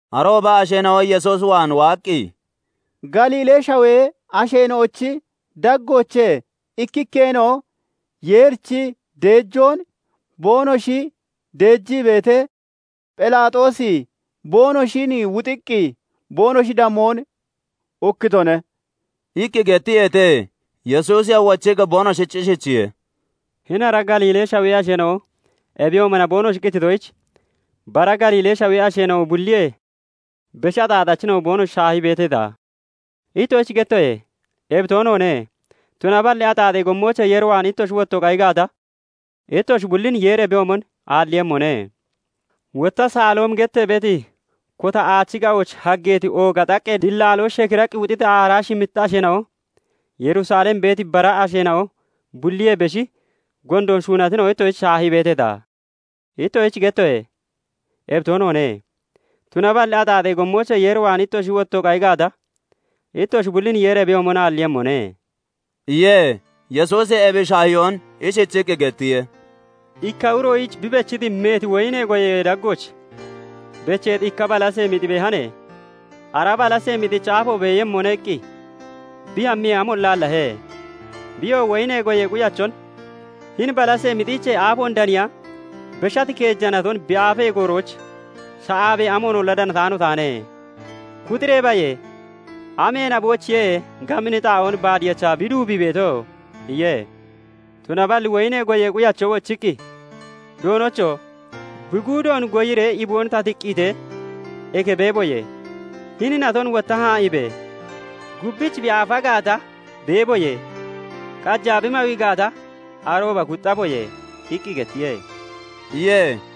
Arooba asheena'o Yesuus waan waaqqi, "Galiilee shawee asheena'ochi daggoochee ikkikkeena'o Yeerich deejoon boonoshi deejii beetee, Phelaaxoosi boonoshin wuxiiqqi boonoshi damoon ukkitone" iqqi gettiyeete. Yesuusiyoo wochiqqi boonoshich ishichiye:- "Hini ara Galiilee Shawee asheena'o ebiyoomona boonoshi qititoyich, bara Galiilee Shawee asheena'o bulliyee beshi axaaxachina'o ittoshich shaahii beeteeta? Ittoshich gettoye; ebi toonoone; tunaballi axaaxee gommoochee Yeer waan ittoshi wottoo qayi gaata, ittoshi bullin Yeeri ebiyoomon aalliiyemmone. Wotta Saloomi gettee beeti kota aachi ga'ooch haggeeti ooga xaqqee dilaaloo shekiraqqi wuxiti aaraa shimmita asheena'o Yerusalem beeti bara asheena'o bulliyee beshi gondoon shuunatina'o ittoshich shaahii beeteeta? Ittoshich gettoye; ebi toonoone; tunaballi axaaxee gommoochee Yeer waan ittoshi wottoo qayi gaata, ittoshi bullin Yeeri ebiyoomon aalliiyemmone" iye. Yesuusi ebi shaahiyoon ishichiqqi gettiye:- "Ikka uroyich bi bechiti meeti woyinee goyee daggooch becheeti ikka balasee mixi beehan. 'Ara balasee mixichi aafo beeyemmone' iqqi bi hammiyee, amolla aallahe. Biyoo woyinee goyee quyachon 'Hini balasee mixiichee aafoon daniya beshati keeja naton bi aafemmi goorooch sha'aabee amoonolla danataano taane. Kuxiree baye! Amee naboyichiye gabini xaa'oon baad yechaa bi duubii beeto?' iye. "Tunaballi woyinee goyee quyacho wochiqqi, 'Doonocho! Bi guudoon goyiree iboon ta tiqqiitee, eke bekkaboyee. Hini naton wotta haa'iibe! Gubbich bi aafa gaata, beeboyee. Qajaa bi mawi gaata, arooba kuxxaboye' iqqi gettiye" iye.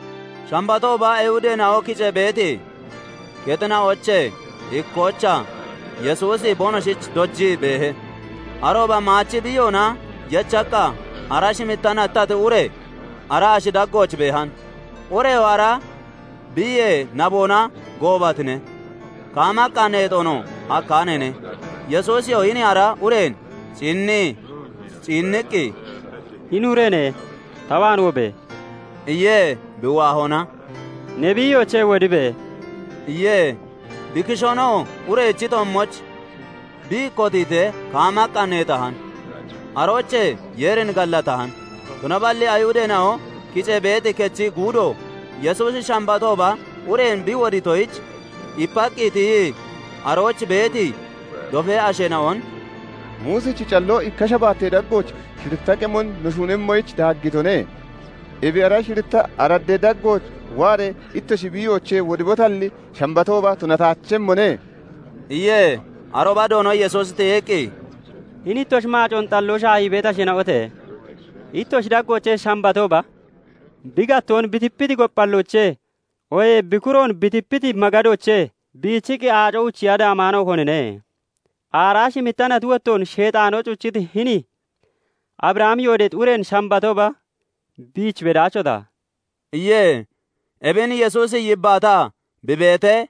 Shambatooba Ayihudeena'o kicee beeti kexina'oochee ikkoochaa Yesuusi boonoshich dojii beehe. Arooba maachi biiyoona yechaqqa aaraa shimitta nattati ure ara ashi daggooch beehan; ureyoo ara biiyee naboona goobatine; kaamaqqa neexoonoo hakkaaneene. Yesuusiyoo hini ara ureen ciinnii ciinniqqi, "Hini ureene! Ta waan wobe!" iye. Bi waahona, "Ne biiyoochee wodibe" iye. Bi kishoonoo urechi toommooch bi kotiitee, kaamaqqa neexahan; aroochee Yeerin gallatahan. Tunaballi Ayihudeena'o kicee beeti kechi guudo, Yesuusi Shambatooba ureen bi wodiitoyich ipaqqi tiyii arooch beeti dofee asheena'on "Muusichi calloo ikka shabaattee daggooch shiritta qemon no shuunemmoyich daaggitone; ebi ara shiritta araddee daggooch waaree ittoshi biiyoochee wodibotalli, Shambatooba tunataachemmone" iye. Arooba Doono Yesuusi tiyiqqi, "Hini ittoshi maacoon xalloo shaahii beeti asheena'ote! Ittoshi daggoochee Shambatooba bi gattoon bi tipati gophalloochee, oohee bi kuroon bi tipati magadoochee biichiqqi aaco uchiya daamaano konine? Aaraa shimitta nati wottoon sheexaanoo cuchiti hini Abrahami yoodeexi ureen Shambatooba biich bedaachota?" iye. Ebin Yesuusi yibbaataa bi beetee,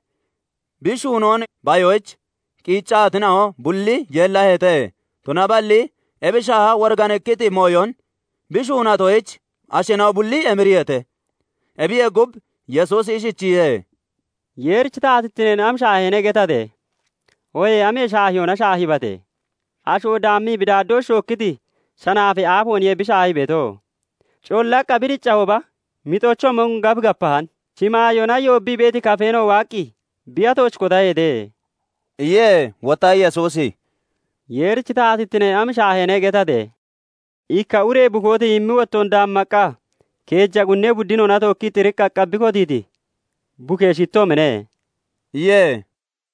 bi shuunoon bayoyich qiiccatina'o bulli yeellaheete; tunaballi ebi shaaha woriganikkiti mooyon bi shuunatoyich, asheena'o bulli emiriyeete. Ebiyee gub, Yesuusi ishichiye:- "Yeerichi taatittine am shaaheene getate? Oohee amee shaahiyoona shaahiibate? Asho daammii bi daaddooch shookkiti shanaafee aafeeniye bi shaahii beeto. Collaqqa bi diccahooba mixochoomon gaf gapahan; shimaayoona yoobbii beeti kafeena'o waaqqi bi atooch kotaheete" iye. Wotta Yesuusi "Yeerichi taatittine am shaaheene getate? Ikka ure bukoo tiyimmi wottoon daammaqqa keeja qunnee buddinoona tookkii xiriqqaqqa bi kotiiti bukee shittoomine" iye.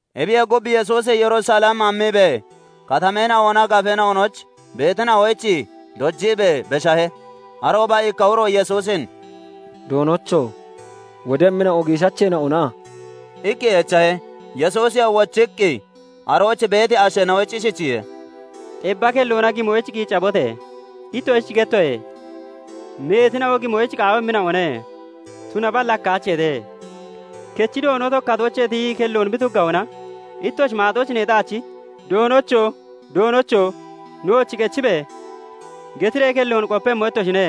Ebiyee gub, Yesuusi Yerusalem hammiibee, katameena'onaa gafeena'onooch beetina'oyich dojiibee beshahe. Arooba ikka uro Yesuusin "Doonocho! Wodemmina'o giishacheena'ona?" iqqi echahe. Yesuusiyoo wochiqqi arooch beeti asheena'oyich ishichiye:- "Xebba kelloona gimoyich qiiccabote! Ittoshich gettoye; meetina'o gimoyich qaawemmina'one; tunaballi hakkaacheete. Kechi doono kotoochee tiyii kelloon bi tuggahona, ittoshi maaxooch neexaachi, 'Doonocho! Doonocho! Nooch qechibe!' getiree kelloon qopemmo ittoshine.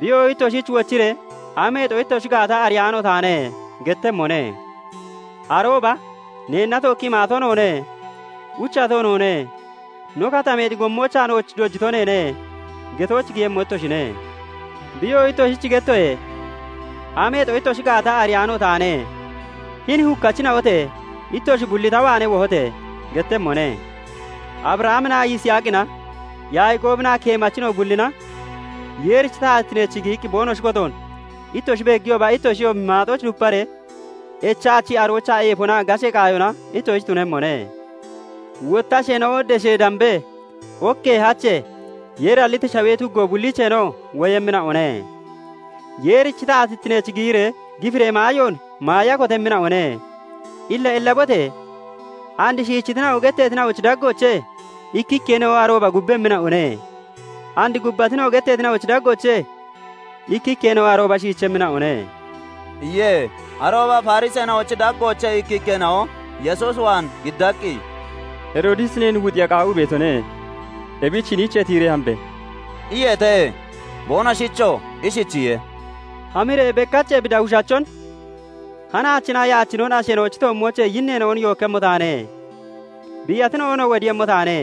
"Biyoo ittoshich wochiree, 'Ameexo ittoshi gaata ariyaano taane' gettemmone. "Arooba 'Neenna tookkii maato noone; uchato noone; no katameexi gommoochaa nooch dojito neene' getooch giyemmo ittoshine. "Biyoo 'Ittoshich gettoye; ameexo ittoshi gaata ariyaano taane; hini hukkachina'ote! Ittoshi bulli ta waanee wohote!' gettemmone. Abrahaminaa Yisaaqina, Yaaqoobinaa keemachina'o bullina Yeerichi taatittineech giyii boonoshi kotoon ittoshi beegiyooba, ittoshiyoo maaxooch duparee echaachi, aroochaa eefonaa gashee qaayona ittoshich tunemmone. Wotta asheena'o deshee, dambee, okkee, hachee, Yeeri halliti shawee tuggo bulliicheenoo woyemmina'one; Yeerichi taatittineech giyiree gifiree maayoon maaya kotemmina'one. Illa ellabote! And 'Shiichitina'o' getteetina'ochi daggoochee ikkikkeena'o arooba gubbemmina'one; And 'gubbatina'o' getteetina'ochi daggoochee ikkikkeena'o arooba shiichemmina'one" iye. Arooba Fariseena'ochi daggoochee ikkikkeena'o Yesuus waan giddaqqi, "Heroodisi neen wuxiiya qaawii beetone. Ebich hiniichee tiyiree hambe!" iyeete. Boonoshichoo ishichiye:- "Hamiree beqach ebi dawishachon ' "Hanaachinaa yaachinon asheena'ochi toommoochee yinneena'on yookkemmo taane; biiyatina'onoo wodiiyemmo taane;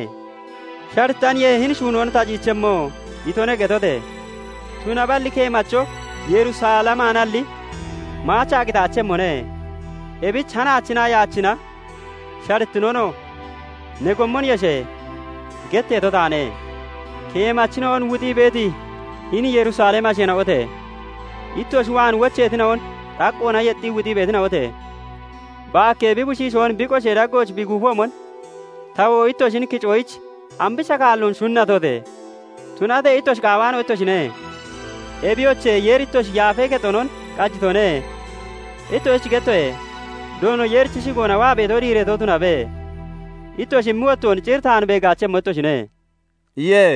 sharittaniye hini shuunoon ta ciichemmo" itone' getote! Tunaballi keemacho Yerusalemaanalli maachaa qitaachemmone; ebich 'Hanaachinaa yaachina, sharittinonoo ne gommon yeshe!' getteeto taane. "Keemachina'on wuxii beeti hini Yerusalemi asheena'ote! Ittoshi waan wocheetina'on xaqqoona yexxii wuxii beetina'ote! Baakkee bi bushiishoon bi qoshee daggooch bi guufoomon, tawoo ittoshin kicoyich ambicha kaalloon shunatote! Tunatee ittoshi qaawaano ittoshine. Ebiyoche, Yeeri ittoshi yaafee kexonon qajitone. Ittoshich gettoye; 'Doono Yeerichi shigoona waa beeto diireeto tunabe!' ittoshi immi wottoon cir taan beegaachemmo ittoshine" iye.